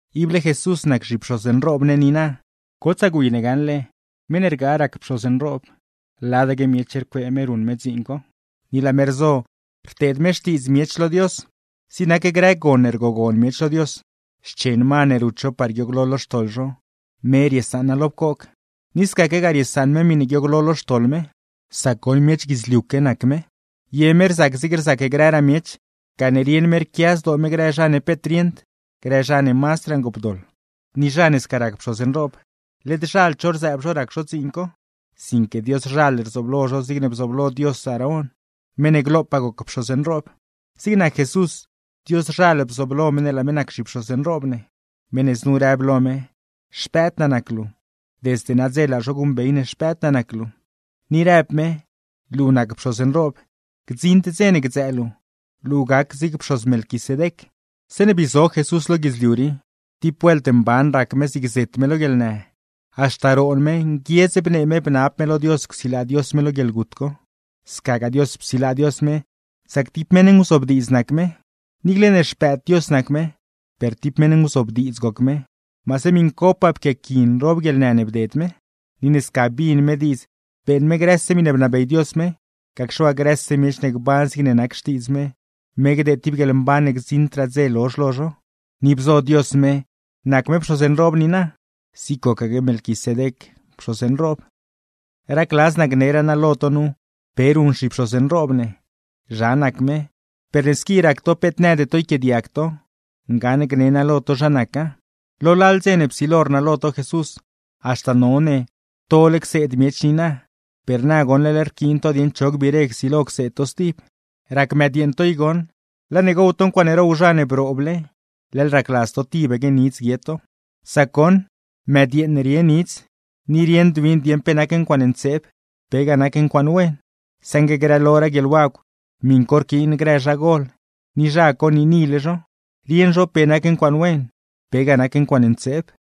Ible Jesús nac zhipxoz nroob ne niina. Gotsaa gwi ne gaṉle, meṉ ne rgaa rac pxoz nroob, ladaque miech rcuee me ruṉ me dziin co, ni laa me rzo rteed me xtiidz miech lo Dios. Zig nac grë gon ne rgogon miech lo Dios, xchen ma ne rut zho par guiooglo lo xtoḻ zho, me riesaṉa lo pcoog; ni scaquegaa riesaṉ me miṉe guiooglo lo xtoḻ me; sac goṉ, miech guidzliuque nac me. Ye me rzac zigne rzac grëraa miech, gane rieṉ me rquia zdoo me grë zha ne peet rieṉd, grë zha ne mazdraa ngoopdoḻ. Ni zha ne sca rac pxoz nroob, led zhald zho rzëëb zho rac zho dziin co, sinque Dioszhal rzooblo zho zigne bzooblo Dios Aarón, meṉ ne glopaa goc pxoz nroob. Zig nac Jesús, Dioszhal bzooblo me ne laa me nac zhipxoz nroob ne; meṉ ne znu rëb lo me: “Xpëëd naa nac luu. Desde nadze laa zho guṉbey ne Xpëëd naa nac luu.” Ni rëb me: Luu nac pxoz nroob, gdziṉd dze ne gdzëë luu, luu gac zig pxoz Melquisedec. Zeeṉe bii zo Jesús lo guidzliu rii, tib vuelt mban rac me zig zet me lo guieḻnë, haxta roon me, nguiedz bnee me bnab me lo Dios csilaa Dios me lo guieḻgut co; scagaa Dios psilaa Dios me, sac tib meṉ nguzobdiidz nac me. Niicle ne Xpëëd Dios nac me, per tib meṉ nguzobdiidz goc me, maase miṉcopaa pquiaqui nroob guieḻnë ne bded me. Ni ne sca bin me diidz beeṉ me grëse miṉe bnabey Dios me, gacxe waa grëse miech ne gban zigne nac xtiidz me, me gdeed tib guieḻmban ne gdziṉdraa dze lozh lo zho; ni bzo Dios me nac me pxoz nroob niina, zigne gocaque Melquisedec pxoz nroob. Racladz naa gneraa naa lo to nu pe ruṉ zhipxoz nroob ne, zha nac me, per ne squi rac to peet nëde to yquiaadiag to, ngaṉ gne naa lo to zha naca. Lo lal dze ne psilo rnalo to Jesús, haxta none tole cseed miech niina, per na goṉ leḻ rquiin to dieṉ cho gbiire csilo cseed to stib. Rac mëdyeeṉ to i goṉ, laa ne gow to ncuaaṉe row zha brooble leḻ racladz to tibaque nidz guie to. Sac goṉ, mëdyeeṉ rie nidz, ni rieṉd win dieṉ pe nac ncuaaṉe ntseeb, pegaa nac ncuaaṉe wen. Saṉgue grëloraa guieḻwagw, miṉ co rquiin grë zha gol, ni zha co niinile zho, rieṉ zho pe nac ncuaaṉe wen, pegaa nac ncuaaṉe ntseeb.